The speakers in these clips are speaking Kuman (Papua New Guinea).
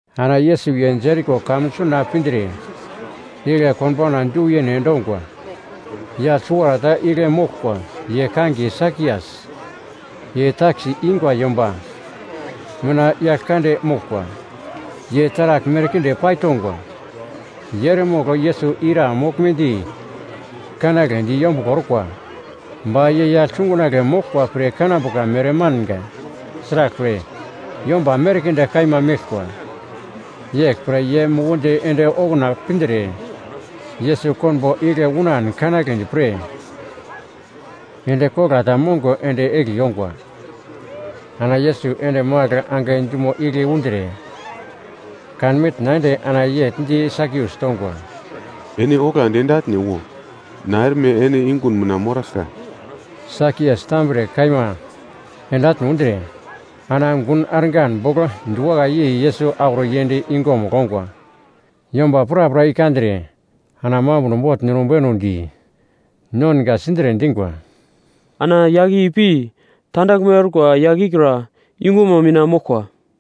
Ana Yesus Jeriko kamun suna pindre igle konbauna du yene endongwa. Yagl suwarata igle moglkwa ye kangiye Sakias, ye takis ingwa yomba mina yagl kande moglkwa. Ye taragl merkinde paitongwa. Ye eremogl Yesus ira moglmedi kanagledi yombuglo orkwa, ba ye yagl sungunagle moglkwa pre kanambuka mere manga, sraglpre, yomba merkinde kaima meglkwa. Yeglpre ye mukundi ende okuna pindre, Yesus konbo igle unan kanagledi pre, endi kogla ta mongo ende egli ongwa. Ana Yesus ende magl angai dumo igle undre, kan mitna ende ana yegl di Sakias tongwa, “Ene oglandi ende atne wo, na erme ene yungun mina moraglka.” Sakias tambre kaima ende atne undre, ana gun argan bogl diwakai yei Yesus auro yend yungumugl ongwa. Yomba prapra i kandre, ana mambuno bogl ninubenu di, nonga sindre dingwa, “Ana yagl i pi tandaglme orkwa yagl ikra yungumo mina moglkwa.”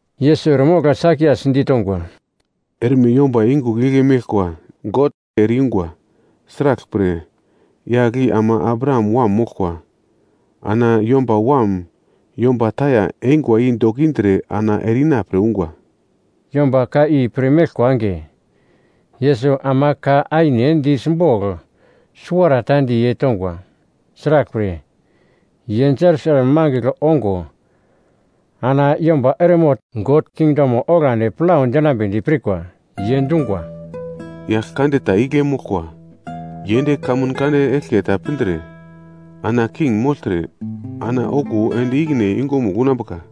Yesus eremogl Sakias ditongwa, “Erme yomba yungugl igle meglkwa God ere-yungwa, sraglpre yagl i ama Abraham wam moglkwa. Ana Yomba Wam yomba taya eingwa i dokindre ana ere-ina pre ungwa.” Yomba ka i pir meglkwa enge, Yesus ama ka aine di simbogl suwarata di ye tongwa. Sraglpre, ye Jerusalem mangigl ongo ana yomba eremogl God kingdomo oglandi plau dinambedi pirkwa. Ye dungwa, “Yagl kande ta igle moglkwa ye ende kamun kande eglke ta pindre, ana king mogltre, ana okuwo ende ikine yungumugl unambuka.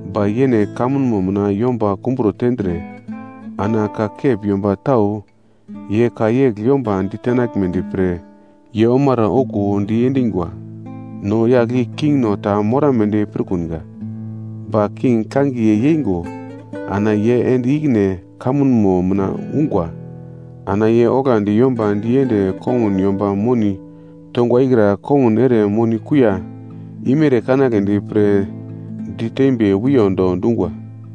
“Ba yene kamunmo mina yomba kumbro tendre, ana ka kep yomba tau ye ka yegl yomba ditenaglmedi pre ye omara okuwo diendingwa, ‘No yagl i kingno ta morambedi pirkunga.’ “Ba king kangiye yeingo, ana ye ende ikine kamunmo mina ungwa. Ana ye oglandi yomba diende kongun yomba moni tongwa ikra kongun ere moni kuiya imere kanagledi pre ditembi wiyondo dungwa.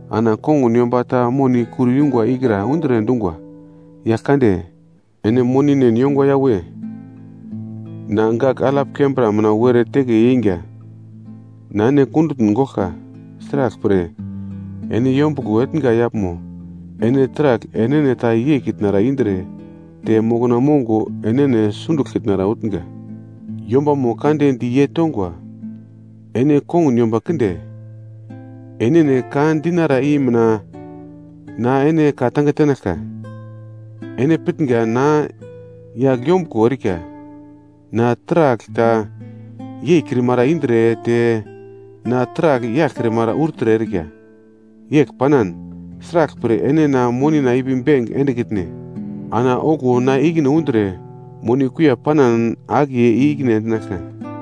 “Ana kongun yomba ta moni kur yungwa ikra undre dungwa, ‘Yaglkande, ene moninen yongwa yawe, na gagl alap kembra mina were teke yeinga. Na ene kundutn goglka, sraglpre, ene yombuglo etnga yaglmo ene taragl enene ta yeikitnara indre te mokna mongo enene sunduglkitnara utnga.’ “Yombamo kande di ye tongwa, ‘Ene kongun yomba kinde, enene ka dinara i mina na ene ka tenaglka. Ene pitnga na yagl yombuglo erika, na taragl ta yeikrimara indre te na taragl yaglkrimara urtre erika. Yegl panan, sraglpre ene na monina ipi benk endekitne? Ana okuwo na ikine undre moni kuiya panan akiye i-ikine endinaglka.’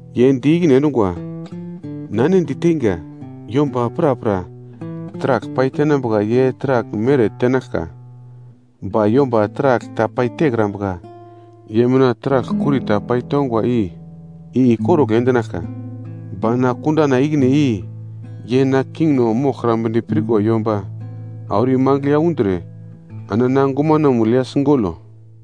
“Ye di ikine endungwa, ‘Na ene diteinga, yomba prapra taragl paitenambuka ye taragl mere tenaglka ba yomba taragl ta paitekrambuka ye mina taragl kuri ta paitongwa i, ikorugl endinaglka. Ba na kundana ikine i, ye na kingno moglkrambedi pirkwa yomba auro imangigl ya undre, ana na gumanamugl ya sigolo.’”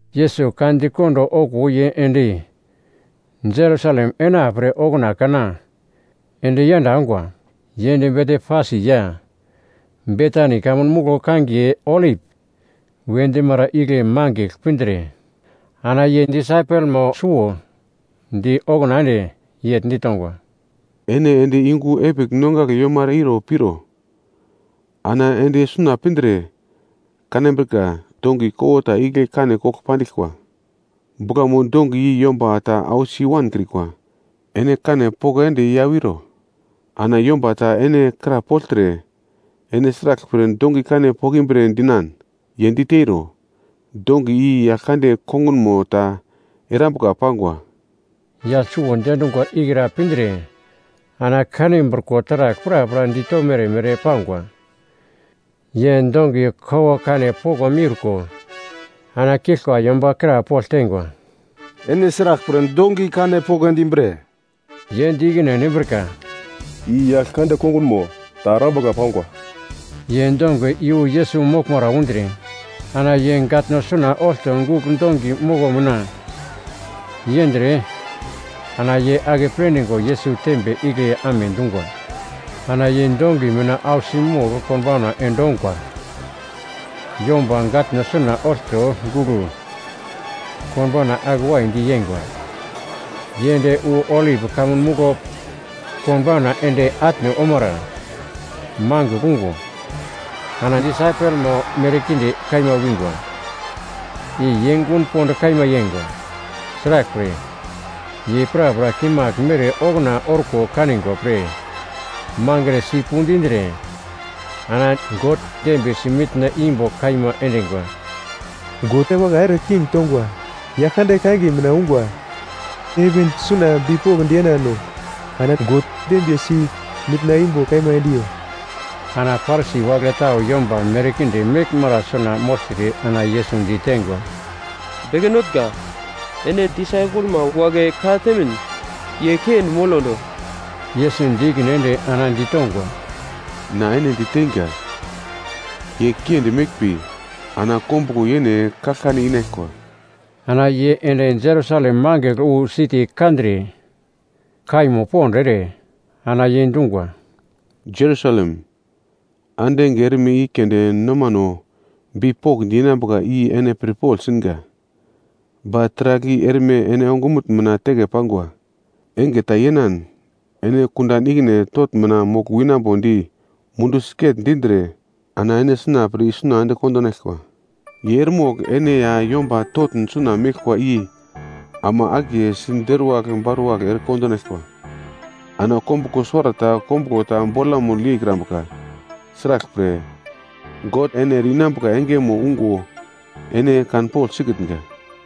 Yesus ka di kondo okuwo ye ende Jerusalem ena pre okuna kana ende yenda ongwa. Ye ende Betfasi ya Betani kamun muglo kangiye Olip we dimara igle mangigl pindre ana ye disaipelmo suwo di okuna ende yegl ditongwa, “Ene ende yungu epigl nongagle yomara iro piro, ana ende suna pindre, kanambrika dongi kowo ta igle kane kogl pandiglkwa, buglamo dongi i yomba ta ausi i-wankrikwa. Ene kane poko ende i ya wiro. Ana yomba ta ene krapoglte, ‘Ene sraglpre dongi kane pokimbre?’ dinan. Ye diteiro, ‘Dongi i Yaglkande kongunmo ta erambuka pangwa.’” Yagl suwo diendungwa ikra pindre ana kanbriko taragl prapra ditomere mere pangwa. Ye dongi kowo kane poko miurko ana kiglkwa yomba krapogl teingwa, “Ene sraglpre dongi kane poko endimbre?” Ye di ikine endimbrika, “I Yaglkande kongunmo ta erambuka pangwa.” Ye dongi iyu Yesus moglmara undre, ana ye gatno suna olto gugl dongi moko mina yendre, ana ye akeple dingo Yesus tembe igle amedungwa. Ana ye dongi mina ausi mogl konbauna endongo, yomba gatno suna olto gugl konbauna ake waidi yeingwa. Ye ende wu Olip Kamun Muglo konbauna ende atne omara mangigl ungo, ana disaipelmo merkinde kaima wingwa. I ye gun pond kaima yeingwa. Sraglpre, ye prapra kimagl mere okuna orko kanigwa pre, mangre sipu dindre, ana God dembiyesi mitna imbo kaima endingwa. “God wakai ere king tongwa, Yaglkande kangiye mina ungwa!” “Heven suna bipokndi yenano, ana God dembiyesi mitna imbo kaima endiyo!” Ana Parisi wagle tau yomba merkinde meglmara suna mogltre ana Yesus diteingwa, “Beke Notnga, ene disaipelma wagle ka-temin ye kiendi molondo.” Yesus di ikine ende ana ditongwa, “Na ene diteinga, ye kiendi meglmbi, ana kombuglo yene kaglkane inaglkwa.” Ana ye ende Jerusalem mangigl wu siti kandre, kaimo pond ere, ana ye dungwa, “Jerusalem, ande enge erme i keunde nomano bipokndi yenambuka i ene pirpogl singa, ba taragl i erme ene ongumutn mina teke pangwa. Enge tau yenan ene kundan ikine totn mina mogl winambodi mundu siget-dindre ana ene sina pre isuna ende kondinaglkwa. Ye eremogl ene ya yomba totn suna meglkwa i ama akiye siderwagl baruwagl ere kondinaglkwa. Ana kombuglo suwarata kombuglo ta bolamugl yeikrambuka. Sraglpre, God ene ere-inambuka engemo ungo ene kanpogl sikitnga.”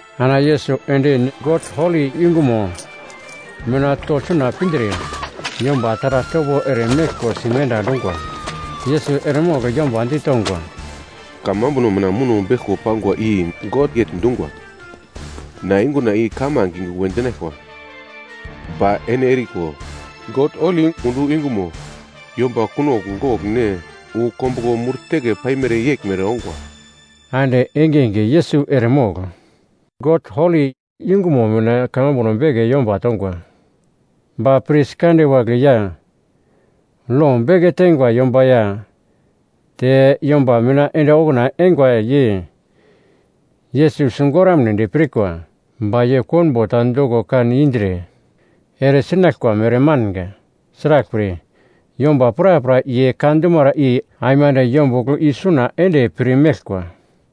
Ana Yesus ende God holi yungumo mina togl suna pindre, yomba taragl topo eremeglko simenda endungwa. Yesus eremogl yomba ditongwa, “Kamambuno mina muno beglko pangwa i God yegl dungwa, ‘Na yunguna i kamange yungu we dinaglkwa.’ Ba ene eriko, God holi yungumo yomba kunogl gogl ne wu kombuglo mur teke paimere yeglmere ongwa.” Ande engenge Yesus eremogl God holi yungumo mina kamambuno beke yomba tongwa. Ba pris kande wagle ya lo beke teingwa yomba ya te yomba mina ende okuna eingwa ye Yesus sigoramnedi pirkwa. Ba ye konbo ta doko kan indre ere sinaglkwa mere manga, sraglpre, yomba prapra ye ka dumara i aimande yombugl i suna ende pir meglkwa.